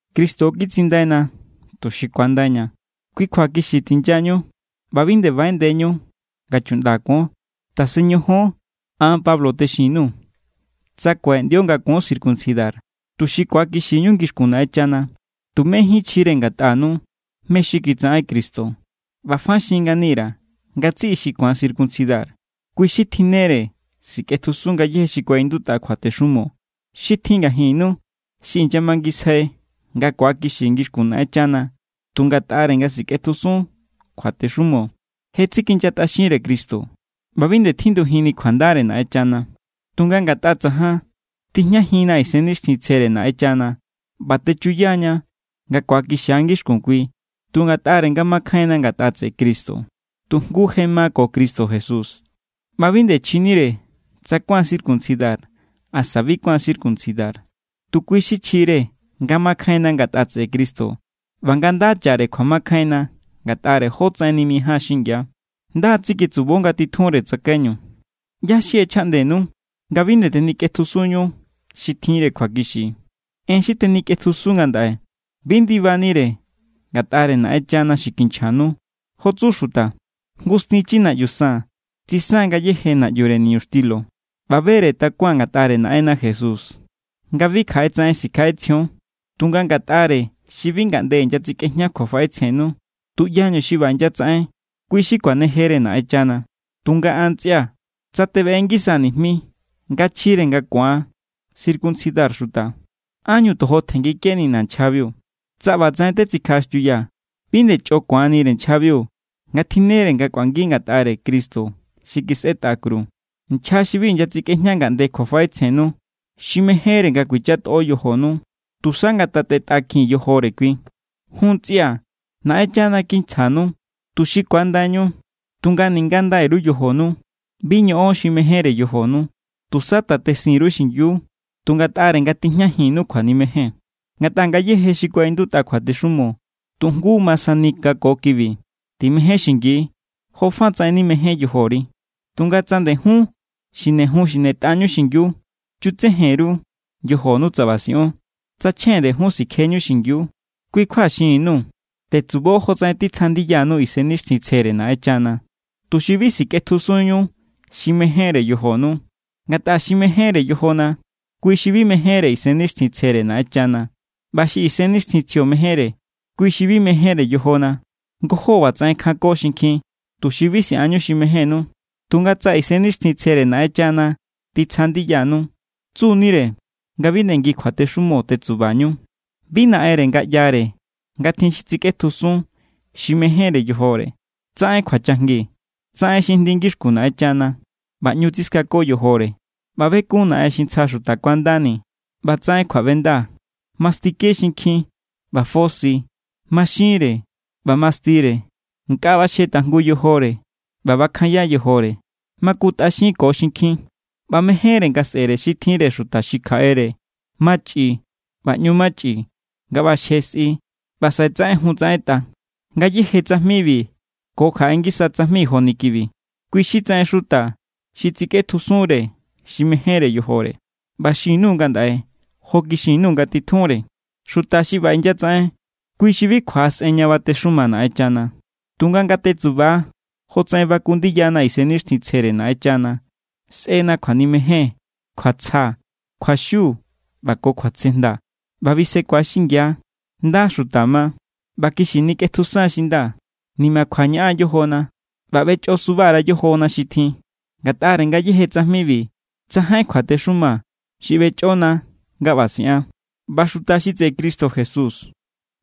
Cristo kitsindaina tuxi ku̱andaiña. Kui kjua kixi tinyañu ꞌba bi nde baꞌeꞌndeñu nga chuꞌnda kuon. Tasen ñojon. An Pablo texin_nuu̱. Tsa kuaꞌeꞌndio nga kuon circuncidar, tuxi ku̱akixiñu ngixkun Naꞌenchana, tumejín chjire ngatꞌanu mé= xi kitsaꞌen Cristo. ꞌBa fa xin ngani_ra̱ ngatsiꞌi xi ku̱an circuncidar. Kui xi tjinnere sikꞌetjusun ngayéje xi kuaꞌindutꞌa kjuatexumo. Xi tjin ngajinnu xi inyamangisjai nga ku̱akixi ngixkun Naꞌenchana tu ngatꞌare nga sikꞌetjusun kjuatexumo, je tsikinyatꞌaxinre Cristo ꞌba bi nde tjindujinni kjuandare Naꞌenchana. Tunga ngatꞌa tsajan, tijñajinna Isennixtjintsjere Naꞌenchana ꞌba techuya=ña nga ku̱akixia̱ ngixkun Kui tu ngatꞌare nga makjainna ngatꞌa tseꞌe Cristo. Tu jngu je ma ko Cristo Jesús ꞌba bi nde chjinire tsa kuáan circuncidar asa bi kuáan circuncidar. Tu kui xi chjire nga makjainna ngatꞌa tseꞌe Cristo ꞌba nga nda chare kjuamakjainna ngatꞌare jotsaꞌen nimijáan xingia. Nda= tsiketsubo nga titjunre tsakaiñu. ¿ꞌYá= xi ꞌechjaꞌndenu nga bi nde tenikꞌetjusunñu xi tjinre kjuakixi? En xi tenikꞌetjusun ngandaꞌe, bi ndibanire ngatꞌare Naꞌenchana xi kinchjanu. Jo tsu xuta: “Jngu stinchi naꞌyu san tsisan ngayéje naꞌyure niñuxtilo.” ꞌBa be=re takuaa̱n ngatꞌare Naꞌenna Jesús nga bi kjaꞌetsaꞌen sikjaꞌetsjion. Tunga ngatꞌare xi bi ngaꞌnde inyatsikꞌejña kjuafaꞌetsjennu, tuꞌyañu xi ꞌba inyatsaꞌen, kui xi kuanejere Naꞌenchana. Tunga an ntsꞌia̱, tsa tebeꞌe ngisaa̱ nijmi nga chjire nga ku̱an circuncidar xuta, ¿ánñu tojo tjenngikenina nchjabiu? Tsa ꞌbatsaꞌen tetsikjaꞌaxtiuyaa̱, bi nde chꞌo ku̱anire nchjabiu nga tjinnere nga kꞌuangi ngatꞌare Cristo xi kisꞌetꞌa kru. Nchja xi bi inyatsikꞌejña ngaꞌnde kjuafaꞌetsjennu, xi mejénre nga kuichatꞌo yojonu, ¡tusa ngatatetꞌakjin yojore kui! Jun ntsꞌia̱, Naꞌenchana kinchjanu tuxi ku̱andaiñu. Tunga ninga ndai_ru yojonu, bi ñoꞌon xi mejénre yojonu. Tusa tatesin_ru xingiu tu ngatꞌare nga tijñajinnu kjuanimejen. Ngatꞌa ngayéje xi kuaꞌindutꞌa kjuatexumo tu jngu ma sani nga ko kibi: “Timején xingi jofatsaꞌen nimején yojori.” Tunga tsa nde jun xinejun xinetꞌañu xingiu, chutsejen_ru yojonu tsa ꞌba siꞌon, tsa chjen nde jun sikjeñu xingiu. Kui kjua xinni_nuu̱. Tetsubo jotsaꞌen titsja ndiyanu Isennixtjintsjere Naꞌenchana, tuxi bi sikꞌetjusunñu xi mejénre yojonu. Ngatꞌa xi mejénre yojona, kui xi bi mejénre Isennixtjintsjere Naꞌenchana. ꞌBa xi Isennixtjintsjio mejénre, kui xi bi mejénre yojona. Ngojó ꞌbatsaꞌen kjanko xinkjin, tuxi bi siꞌanñu xi mejénnu. Tunga tsa Isennixtjintsjere Naꞌenchana titsja ndiyanú, tsu=nire nga bi nde ngi kjuatexumo tetsubañu. Bi naꞌenre nga ꞌyare nga tjin xi tsikꞌetjusun xi mejénre yojore. Tsaꞌen kjuachajngi, tsaꞌen xi jndi ngixkun Naꞌenchana, ꞌba ꞌñu tsiskako yojore, ꞌba bekun naꞌen xi ntsja xuta kuandani, ꞌba tsaꞌen kjuaꞌbenda, mastike xinkjin, ꞌba fosi, maxinre, ꞌba mastire, nkꞌa ꞌbaxje tajngu yojore, ꞌba bakjanya yojore, makutꞌaxinko xinkjin, ꞌba mejénre nga sꞌe̱re xi tjinre xuta xi kjaꞌere, machꞌi, ꞌba ꞌñu machꞌi nga ꞌbaxje sꞌi ꞌba saꞌe tsaꞌenjun tsaꞌentꞌa. Ngayéje tsajmibi ko kjaꞌe ngisa tsajmi joni kibi, kui xi tsaꞌen xuta xi tsikꞌetjusunre xi mejénre yojore. ꞌBa xin_nuu̱ ngandaꞌe jo kixin_nuu̱ nga titjunre. Xuta xi ꞌba inyatsaꞌen, kui xi bi kjuaꞌasꞌen ña batexuma Naꞌenchana. Tunga nga tetsuba jotsaꞌen baku ndiyana Isennixtjintsjere Naꞌenchana, sꞌena kjuanimejen, kjuatsja, kjuaxiu, ꞌba ko kjuatsejnda. ꞌBa bisekua xingia, nda xuta ma, ꞌba kixi nikꞌetjusan xi nda, nimakjua ñaꞌan yojona, ꞌba ꞌbechꞌosuba_ra yojona xi tjin. Ngatꞌare ngayéje tsajmibi tsajain kjuatexuma xi ꞌbechꞌona nga ꞌba siꞌan. ꞌBa xuta xi tseꞌe Cristo Jesús,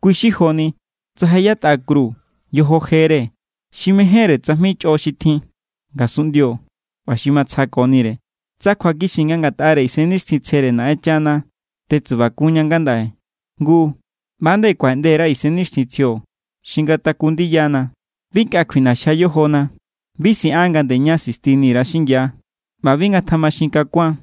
kui xi joni tsa je yatꞌa kru yojo jere xi mejénre tsajmi chꞌo xi tjin ngasunꞌndio ꞌba xi matsjakonire. Tsa kjuakixi nga ngatꞌare Isennixtjintsjere Naꞌenchana tetsubakunña ngandaꞌe, ngu, ꞌba nde kuaꞌeꞌnde_ra nga Isennixtjintsjio xi ngataku ndiyana. Bi nkꞌa kjuiꞌnaxjia yojona, bi siꞌan nga nde ña sistini_ra xingia, ꞌba bi ngatjamaxinkakuan.